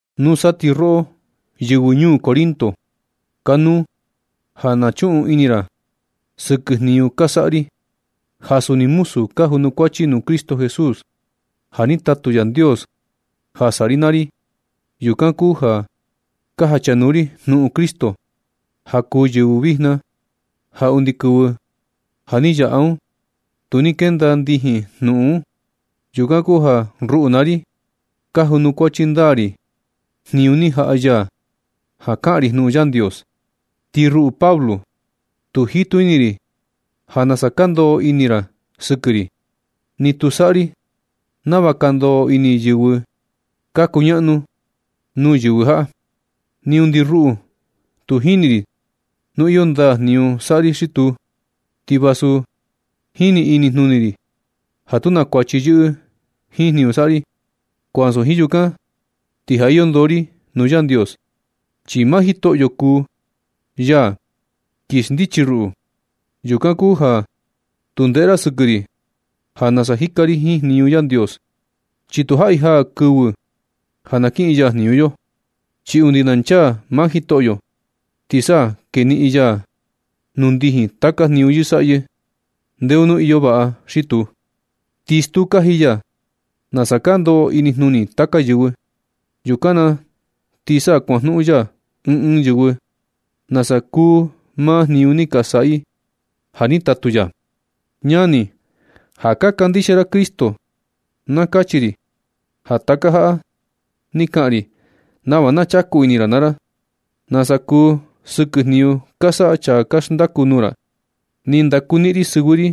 Nusa ti roꞌo, yɨvɨ ñuu Corinto, kanuu ja na chuꞌun ini ra sɨkɨ jniñu ka saꞌa ri, ja suni muzu ka junukuachi nuu Cristo Jesús ja ni tatu Yandios ja saꞌa ri naa ri. Yukan kuu ja ka jachanuu ri jnuꞌun Cristo ja kuu kɨvɨ vijna ja undi kɨvɨ ja ni yaꞌa un, tu ni kenda ndijin jnuꞌun un. Yukan kuu ja ruꞌu naa ri, ka junukuachi ndaa ri jniñu ni jaꞌa ya ja ka kaꞌan ri jnuꞌun Yandios. Ti ruꞌu Pablo, tu jitu ini ri ja nasa ka ndoꞌo ini ra sɨkɨ ri. Ni tu saꞌa ri nava ka ndoꞌo ini yɨvɨ ka kuñaꞌnu nuu yɨvɨ jaꞌa, ni undi ruꞌu tu jini ri nu iyo ndaa jniñu saꞌa ri xi tuu. Ti vasu jini inijnuni ri ja tu na kuachi yɨꞌɨ jiin jniñu saꞌa ri, ko ansu jiin yukan, ti ja iyo ndoo ri nuu Yandios, chi maa Jitoꞌyo kuu ya kin xndichi ruꞌu. Yukan kuu ja tu ndeꞌe ra sɨkɨ ri ja nasa jika ri jiin jniñu Yandios, chi tu jaꞌi jaa kɨvɨ ja na kiꞌin ya jniñu yo. Chi undi na nchaa maa Jitoꞌyo, ti sa na keniꞌin ya nuu ndijin taka jniñu yɨsaꞌyɨ ndeo nu iyo vaꞌa xi tuu. Ti stuu kaji ya nasa ka ndoꞌo inijnuni taka yɨvɨ. Yukan na ti sa kuajnuꞌun ya ɨɨn ɨɨn yɨvɨ nasa kuu maa jniñu ni ka saꞌa i ja ni tatu ya. Ñani, ja ka kandixia ra Cristo, na kachi ri ja taka jaꞌa ni kaꞌan ri nava na chaku ini ra naa ra, nasa kuu sɨkɨ jniñu ka saꞌa chaa ka xndaku nuu ra. Ni ndakuniꞌin ri sɨvɨ ri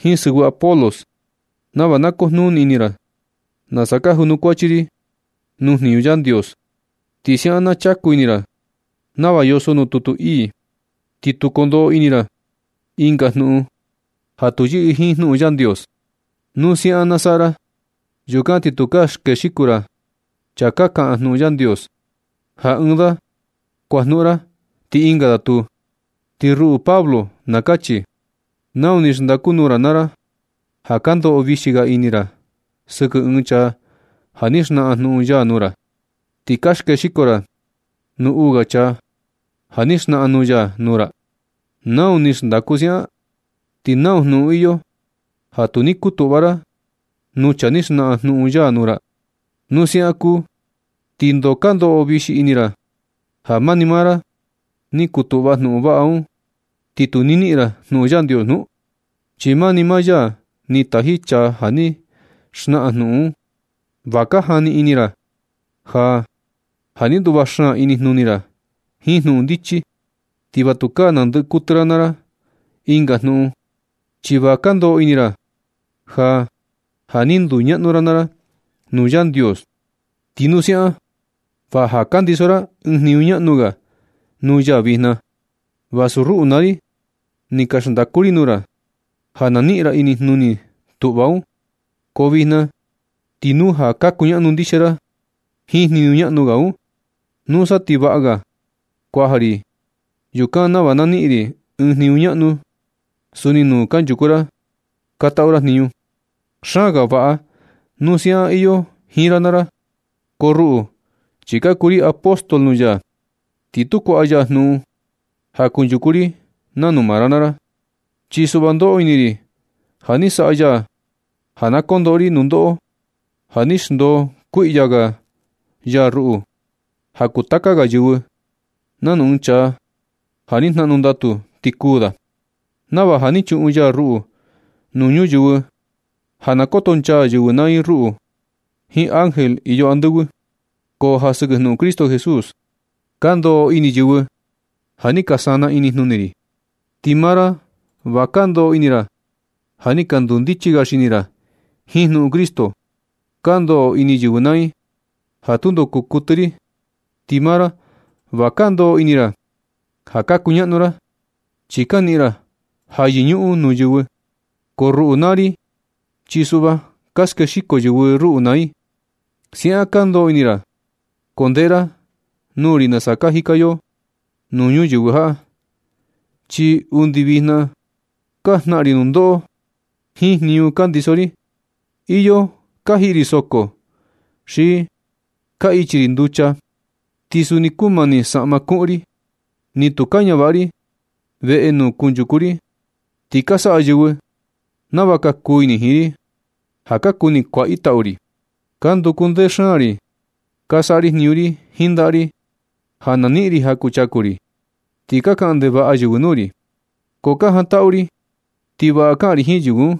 jiin sɨvɨ Apolos, nava na kujnuni ini ra nasa ka junukuachi ri nuu jniñu Yandios. Ti siaꞌan na chaku ini ra nava yoso nuu tutu ii, ti tu kondoꞌo ini ra ɨnga jnuꞌun ja tu yɨꞌɨ jiin jnuꞌun Yandios. Nu siaꞌan na saꞌa ra, yukan ti tukaa skexiko ra chaa ka kaꞌan jnuꞌun Yandios, ja ɨɨn da kuajnuꞌun ra ti ɨnga da tuu. Ti ruꞌu Pablo na kachi, ¿Nau ni xndaku nuu ra naa ra ja ka ndoꞌo vixi ga ini ra sɨkɨ ɨɨn chaa ja ni xnaꞌan jnuꞌun ya nuu ra, ti ka skexiko ra nuu uu ga chaa ja ni xnaꞌan jnuꞌun ya nuu ra? ¿Nau ni xndaku siaꞌan? ¿Ti nau jnuꞌun iyo ja tu ni kutuꞌva ra nuu chaa ni xnaꞌan jnuꞌun ya nuu ra? Nu siaꞌan kuu, ¿ti ndoo ka ndoꞌo vixi ini ra ja mani maa ra ni kutuꞌva jnuꞌun vaꞌa un, ti tu ni niꞌin ra nuu Yandios nu? Chi mani maa ya ni taji chaa ja ni xnaꞌan jnuꞌun un. Va ka jani ini ra ja ja ni kutuꞌva xaan inijnuni ra jiin jnuꞌun ndichi, ti va tukaa nandɨꞌɨ kuɨtɨ ra naa ra ɨnga jnuꞌun, chi va ka ndoꞌo ini ra ja, ja ni nduñaꞌnu ra naa ra nuu Yandios. Ti nu siaꞌan va ja ka ndiso ra ɨɨn jniñu ñaꞌnu ga nuu ya vijna, vasu ruꞌu naa ri ni ka xndaku ri nuu ra ja na niꞌin ra inijnuni tuꞌva un. Ko vijna ti nu ja ka kuñaꞌnu ndixia ra jiin jniñu ñaꞌnu ga un, nusa ti vaꞌa ga kuaja ri yukan nava na niꞌin ri ɨɨn jniñu ñaꞌnu suni nuu kanchuku ra ka taꞌu ra jniñu. Xaan ga vaꞌa nu siaꞌan iyo jiin ra naa ra. Ko ruꞌu, chi ka kuu ri apóstol nuu ya, ti tu kuaꞌa ya jnuꞌun ja kunchuku ri nanu maa ra naa ra. Chi suꞌva ndoꞌo ini ri ja ni saꞌa ya ja na kondoꞌo ri nundoꞌo, ja ni xndoo kuiꞌya ga ya ruꞌu ja kuu taka ga yɨvɨ, nanu ɨɨn chaa ja ni jnaꞌnu ndatu ti kuū da. Nava ja ni chuꞌun ya ruꞌu nuu ñuyɨvɨ ja na kotonchaa yɨvɨ naa i ruꞌu jiin ángel iyo andɨvɨ. Ko ja sɨkɨ jnuꞌun Cristo Jesús ka ndoꞌo ini yɨvɨ ja ni ka sanaa inijnuni ri. Ti maa ra va ka ndoꞌo ini ra ja ni ka ndundichi ga xini ra jiin jnuꞌun Cristo. Ka ndoꞌo ini yɨvɨ naa i ja tundo kuu kuɨtɨ ri, ti maa ra va ka ndoꞌo ini ra ja ka kuñaꞌnu ra. Chi ka niꞌin ra ja yɨñuꞌun nuu yɨvɨ, ko ruꞌu naa, ri chi suꞌva ka skexiko yɨvɨ ruꞌu naa i. Siaꞌan ka ndoꞌo ini ra, ko ndeꞌe ra nuu ri nasa ka jika yo nuu ñuyɨvɨ jaꞌa. Chi undi vijna ka jnaꞌan ri nundoꞌo jiin jniñu ka ndiso ri. Iyo ka jiꞌi ri soko xi ka ichi ri nducha, ti suni kumani saꞌma kuꞌun ri. Ni tu ka ñavaꞌa ri veꞌe nuu kunchuku ri, ti ka saꞌa yɨvɨ nava kuu ini i jiin ri ja ka kuni kuaꞌa i tau ri. Ka nduku ndee xaan ri ka saꞌa jniñu ri jiin ndaꞌa ri ja na niꞌin ri ja kuchaku ri. Ti ka kaꞌan ndevaꞌa yɨvɨ nuu ri, ko ka jantaꞌu ri ti vaꞌa kaꞌan ri jiin yɨvɨ un.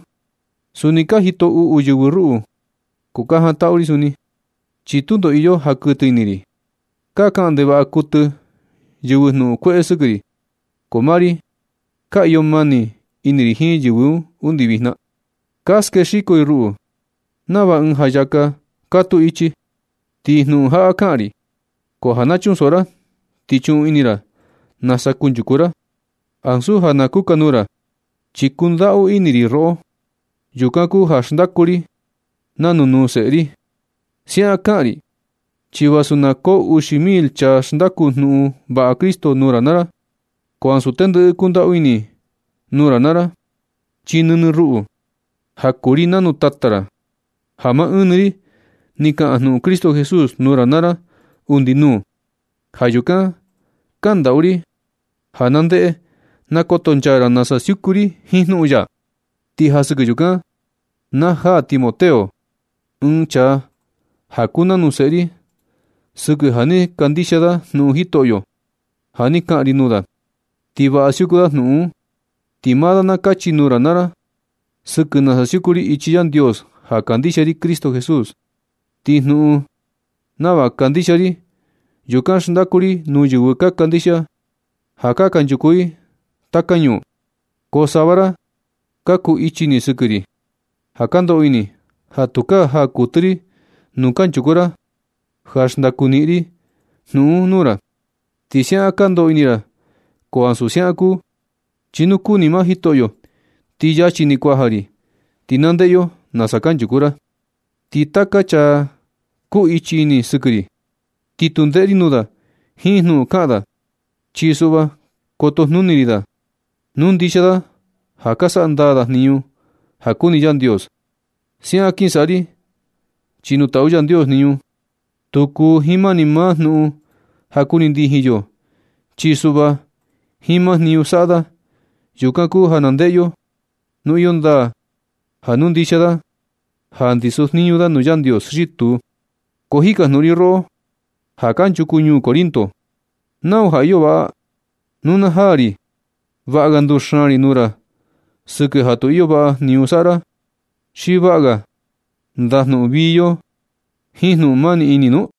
Suni ka jito uꞌu yɨvɨ ruꞌu, ko ka jantaꞌu ri suni, chi tundo iyo ja kuɨtɨ ini ri. Ka kaꞌan ndevaꞌa kuɨtɨ yɨvɨ jnuꞌun kueꞌe sɨkɨ ri, ko maa ri ka iyo mani ini ri jiin yɨvɨ un undi vijna. Ka skexiko i ruꞌu nava ɨɨn jayaka katuu ichi. Ti jnuꞌun jaꞌa kaꞌan ri, ko ja na chunsoꞌo ra ti chuꞌun ini ra nasa kunchuku ra ansu ja na kukanuu ra, chi kundaꞌu ini ri roꞌo. Yukan kuu ja xndaku ri nanu nuu seꞌe ri. Siaꞌan kaꞌan ri chi vasu na koo uxi mil chaa xndaku jnuꞌun vaꞌa Cristo nuu ra naa ra, ko ansu tendɨꞌɨ kundaꞌu ini nuu ra naa ra, chi nɨnɨ ruꞌu, ja kuu ri nanu tata ra, ja maa ɨɨn ni ri ni kaꞌan jnuꞌun Cristo Jesús nuu ra naa ra undi nuu. Ja yukan kandaꞌu ri ja na ndeꞌe na kotonchaa ra nasa siuku ri jiin jnuꞌun ya. Ti ja sɨkɨ yukan na jaa Timoteo, ɨɨn chaa ja kuu nanu seꞌe ri sɨkɨ ja ni kandixia da jnuꞌun Jitoꞌyo ja ni kaꞌan ri nuu da. Ti vaꞌa siuku da jnuꞌun un, ti maa da na kachi nuu ra naa ra sɨkɨ nasa siuku ri ichi Yandios ja kandixia ri Cristo Jesús. Ti jnuꞌun nava kandixia ri, yukan xndaku ri nuu yɨvɨ ka kandixia ja kanchuku i taka ñuu. Ko sava ra ja ka kuu ichi ini sɨkɨ ri, ja ka ndoꞌo ini ja tukaa jaa kuɨtɨ ri nuu kanchuku ra ja xndaku niꞌin ri jnuꞌun un nuu ra. Ti siaꞌan ka ndoꞌo ini ra ko ansu siaꞌan kuu, chi nu kuni maa Jitoꞌyo, ti yachi ni kuaja ri, ti na ndeꞌe yo nasa kanchuku ra. Ti taka chaa ka kuu ichi ini sɨkɨ ri, ti tu ndeꞌe ri nuu da jiin jnuꞌun kaꞌan da. Chi suꞌva kotojnuni ri da nu ndixia da ja ka saꞌa ndaa da jniñu ja kuni Yandios. Siaꞌan kin saꞌa ri, chi nu taꞌu Yandios jniñu, tu kuu jiin mani maa jnuꞌun ja kuni ndijin yo. Chi suꞌva jiin maa jniñu saꞌa da, yukan kuu ja na ndeꞌe yo nu iyo ndaa ja nu ndixia da ja ndiso jniñu da nuu Yandios xi tuu. Ko jikajnuꞌun ri roꞌo ja kanchuku ñuu Corinto, ¿Nau ja iyo vaꞌa? ¿Nu na jaa ri, vaꞌa ga nduxaan ri nuu ra sɨkɨ ja tu iyo vaꞌa jniñu saꞌa ra, xi vaꞌa ga ndajnuꞌun vii yo jiin jnuꞌun mani ini nu?